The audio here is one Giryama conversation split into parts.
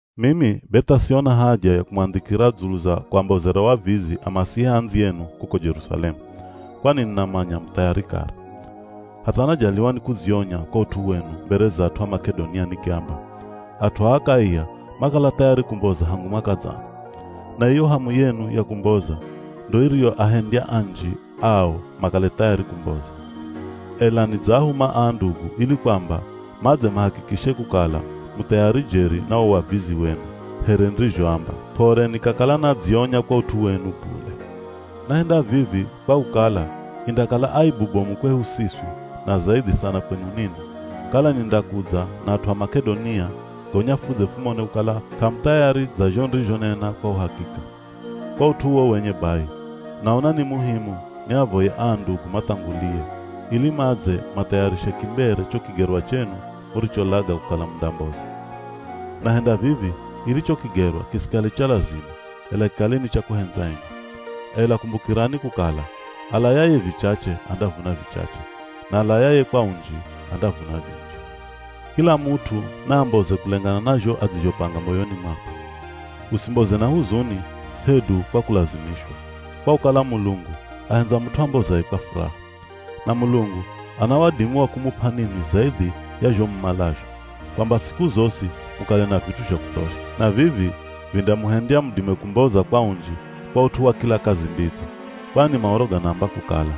Mimi be tha siona haja ya kumwandhikira dzulu za kuambozera wavizi Amasihia andziyenu kuko Jerusalemu, kwani ninamanya mu thayari kare. Hatha najaliwa ni kudzionya kwa ut'u wenu mbere za at'u a Mak'edonia nikiamba, “At'u a Akaia makala thayari kumboza hangu mwaka dzana.” Na iyo hamu yenu ya kumboza ndo iriyoahendya anji ao makale thayari kumboza. Ela nidzaahuma aa ndugu ili kwamba madze mahakikishe kukala mu thayari jeri na wo wavizi wenu here nirizhoamba, p'ore nikakala nadzionya kwa ut'u wenu bule. Nahenda vivi kwa kukala indakala aibu bomu kwehu siswi na zaidhi sana kwenu ninwi, kala nindakudza na at'u a Mak'edonia gonya fudze fumone kukala k'amu thayari dza zho nirizhonena kwa uhakika. Kwa ut'u uwo wenye bai, naona ni muhimu niavoye aa ndugu mathangulie, ili madze mathayarishe kimbere cho kigerwa chenu muricholaga kukala mundamboza. Nahenda vivi ili cho kigerwa kisikale cha lazima, ela kikale ni cha kuhendza enye. Ela kumbukirani kukala alayaye vichache andavuna vichache. Na alayaye kwa unji andavuna vinji. Kila mut'u naamboze kulengana na zho adzizhopanga moyoni mwakwe. Usimboze na huzuni hedu kwa kulazimishwa, kwa kukala Mulungu ahendza mut'u ambozaye kwa furaha. Na Mulungu ana wadimi wa kumup'a ninwi zaidhi ya zho mumalazho, kwamba siku zosi mukale na vit'u zha kuthosha. Na vivi vindamuhendya mudime kumboza kwa unji kwa ut'u wa kila kazi mbidzo. Kwani Maoro ganaamba kukala,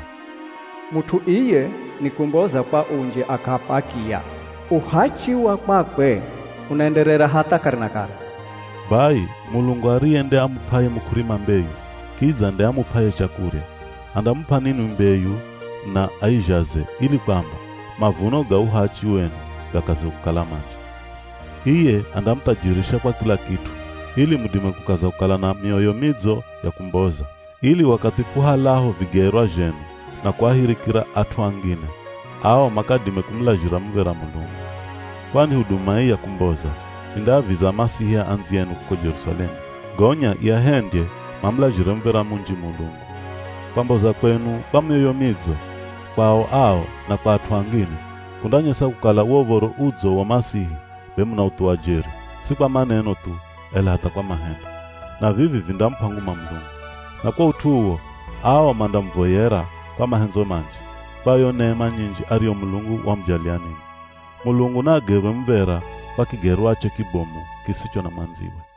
“Mut'u iye nikumboza kwa unji akaap'a akiya. Uhachi wa kwakwe unaenderera hatha kare na kare.” Bai, Mulungu ariye nde amup'aye muk'urima mbeyu, kidza nde amup'aye chakurya, andamup'a ninwi mbeyu na aizhaze ili kwamba mavuno ga uhachi wenu gakaze kukala manji. Iye andamuthajirisha kwa kila kit'u ili mudime kukaza kukala na mioyo midzo ya kumboza, ili wakathi fuhalaho vigerwa zhenu na kuahirikira at'u angine, ao makadime kumulazhira muv̱era Mulungu. Kwani huduma ii ya kumboza indaaviza Amasihia andziyenu kuko Jerusalemu, gonya iahendye mamulazhire muv̱era munji Mulungu. Kwamboza kwenu kwa mioyo midzo, kwao ao, na kwa at'u angine, kundanyesa kukala wo Uv̱oro Udzo wa Masihi be munauthuwa jeri, si kwa maneno thu, ela hatha kwa mahendo. Na vivi vindamup'a nguma Mulungu. Na kwa ut'u uwo, ao mandamuvoyera kwa mahendzo manji, kwa yo nema nyinji ariyo Mulungu wamujalia ninwi. Mulungu naagerwe muv̱era kwa kigerwache kibomu kisicho na mwandziwe.